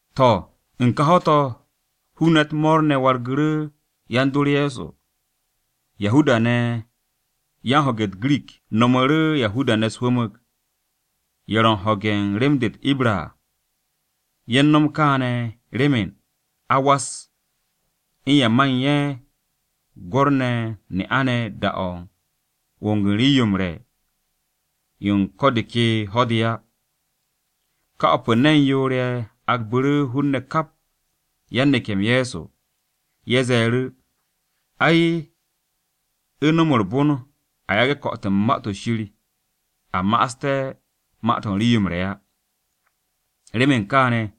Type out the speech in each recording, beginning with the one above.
To̱, u̱n ka ho̱-to̱, hun-ne̱ u̱t-mo̱o̱r ne̱ wargu̱ru̱ yan-dor Ye̱so. Yahuda-ne̱ yan-ho̱ge̱ u̱t-Girik nomu̱ru̱ Yahuda-ne̱ u̱s-hwu̱mu̱g ye̱ ro̱ u̱n ho̱ge̱ u̱n rem-de u̱t-Ibra à. Ye̱ u̱n no̱m kaane̱ remen a m-was u̱n ye̱ man ye̱ gwo̱r-ne̱ ye̱ u̱n ne'a-ne̱ da-o̱ u̱n wong u̱n rii-yo m-re̱ yo u̱n ko̱ de ke ho̱-de á. Ka o̱p u̱n ne̱n yoor-ye̱ agbu̱ru̱ hun-ne̱ kap yan-neke̱-m Ye̱so. Ye̱ ze̱e̱ru̱, “Ai, u̱ no̱m u̱r-bon a yage̱ ko̱'o̱t-m u̱n Ma-to̱ Shir a ma'aste̱ ma-to̱ u̱n rii-yo m-re̱ á. Remen kaane̱,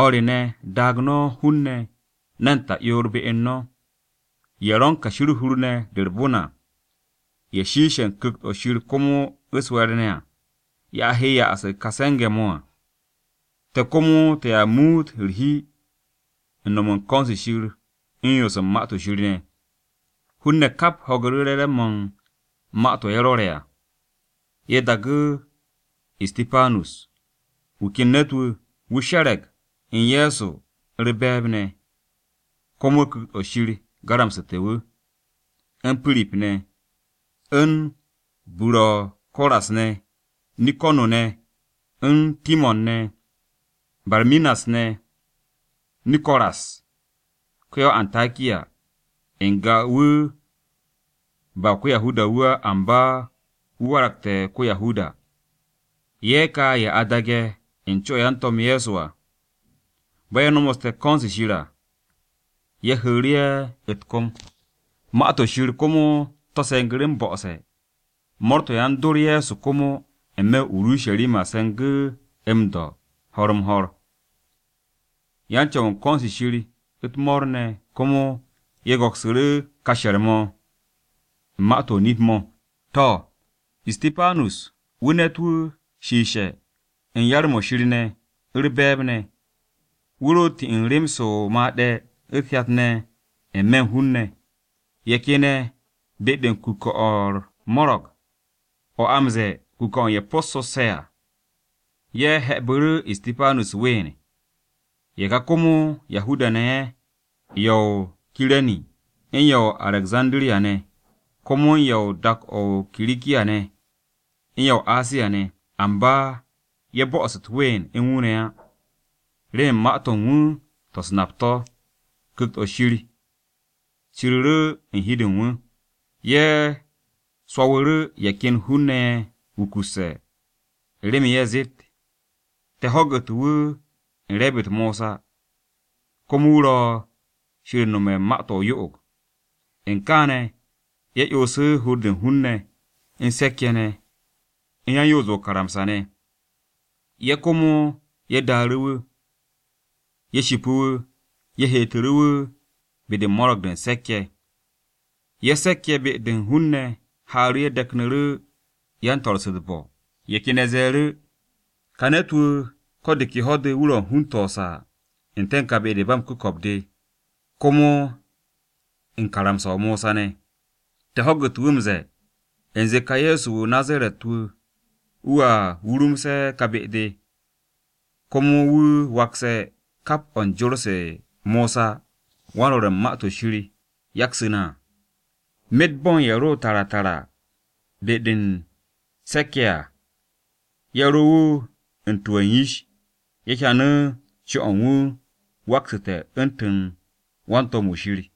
o̱r re ne̱ daag no̱ hun-ne̱ ne̱n ta'yoor be u̱n no̱, ye̱ ro̱ u̱n kashi u̱r-hur ne̱ de u̱r-bon à, ye̱ shiishe̱ u̱n Ku̱kt-o̱ Shir komo u̱s-we̱e̱r ne̱ à, ye̱ a he m-ya'as u̱n ka se̱nge̱-mo̱ à. Te̱ komo te̱a muut u̱r-hi u̱n no̱m u̱n ko̱n-se Shir u̱n yoos u̱n Ma-to̱ Shir ne̱.” Hun-ne̱ kap ho̱gu̱ru̱ re̱re̱m-mo̱ u̱n ma-to̱ ye̱ rwo̱re̱ à. Ye̱ daagu̱ Istipanus (wu̱ ken ne̱t-wu̱ wu̱ she̱re̱g u̱n Ye̱so u̱r-be̱e̱b ne̱, komo Ku̱kt-o̱ Shir garamsu̱te̱ wu̱), u̱n Pirip ne̱, u̱n Buro̱ko̱ras ne̱, Nikano̱ ne̱, u̱n Timo̱n ne̱, Barminas ne̱, Niko̱ras (ko-ya-o-Antakiya, n-ga wu̱ ba ko-Yahuda-wu̱ á amba wu̱ waragte̱ ko-Yahuda). Ye̱ ka ye̱ a daage̱ u̱n co-o̱ yan-To̱m Ye̱so. Bo̱ ye̱ nomoste̱ ko̱n-se Shir à, ye̱ seku̱ru̱ ye̱ u̱t-kom. Ma-to̱ Shir komo to̱ se̱ngu̱ru̱ m-bo̱'o̱se̱. Mo̱o̱r-to̱ yan-dor Ye̱so komo n-me̱ o-Urusharima se̱ngu̱ m-do̱ ho̱r-m-ho̱r, yan-Co̱w u̱n ko̱n-se Shir u̱t-mo̱o̱r ne̱ komo ye̱ go̱ksu̱ru̱ ka she̱r-mo̱ u̱n ma-to̱ o-nip mo̱. To̱, Istipanus, wu̱ ne̱t-wu̱ shiishe̱ u̱n yar-mo̱ Shir ne̱ u̱r-be̱e̱b ne̱. Wu̱ ro m-no̱m u̱n rem-se o-made̱ u̱t-hyat ne̱ n-me̱ u̱n hun-ne̱. Ye̱ ken ye̱ be-de u̱n kuke̱-o̱ u̱r-mo̱ro̱g o̱ a m-ze̱e̱ Kuke̱-o̱ u̱n ye̱ Possu̱sse̱ à, ye̱ he̱'e̱bu̱ru̱ Istipanus u̱t-ween. Ye̱ ka komo Yahuda-ne̱ ye̱ ye̱ o-Kire̱ni u̱n ye̱ o-Arekzandiriya ne̱, komo u̱n ye̱ u̱n dak-o̱ o-Kirikiya ne̱, u̱n ye̱ o-Asiya ne̱. Amba, ye̱ bo'os u̱t-ween u̱n wu̱ ne̱ á, remen ma-to̱ u̱n wu̱ to̱ u̱s-nap to̱, Ku̱kt-o̱ Shir ciriru̱ u̱n hi-de u̱n wu̱. Ye̱ swo̱wu̱ru̱ ye̱ ken hun-ne̱ ye̱ wukusse̱ u̱n remen ye̱ zeet, “Te̱ ho̱gu̱te̱ wu̱ u̱n re̱e̱b-u̱t Mosa, komo wu̱ ro̱ Shir u̱n nome̱ u̱n ma-to̱ o-yo'og.” U̱n kaane̱, ye̱ 'yonsu̱ hur-de u̱n hun-ne̱, u̱n se̱k-ye̱ ne̱, u̱n yan-Yoos-de o-karamsa ne̱. Ye̱ komo ye̱ daaru̱ wu̱, ye̱ shipu̱ wu̱. Ye̱ heetu̱ru̱ wu̱ be-de u̱n Mo̱ro̱g-de u̱n Se̱k-ye̱. Ye̱ ken se̱k-ye̱ be-de u̱n hun-ne̱ haaru̱ ye̱ deknu̱ru̱ yan-swo̱-se u̱t-bo̱, ye̱ ken ye̱ ze̱e̱ru̱, “Ka ne̱t-wu̱ ko̱ de ke ho̱-de wu̱ ro̱ u̱n hun-to̱ o-saa n-te̱ u̱n ka be-de ba m-ku̱ko̱p de komo u̱n karamsa-o Mosa ne̱. Te̱ ho̱gu̱te̱ wu̱ m-ze̱e̱ u̱nze ka Ye̱so-wu̱ o-Nazaret-wu̱ wu̱a wurumse̱ ka be-de, komo wu̱ wakse̱ kap o̱ u̱n jor-se Mosa, wan-Rwo̱r u̱n Ma-to̱ Shir, yaksu̱ na à.” Myet bo̱ u̱n ye̱ ro tara tara be-de u̱n Mo̱ro̱g-de u̱n Se̱k-ye̱ à, ye̱ ro wu̱ u̱n tu u̱n yish-ye̱ hyanu̱ co-o̱ u̱n wu̱ waksu̱te̱ u̱ntu̱n wan-to̱m-wu̱ Shir.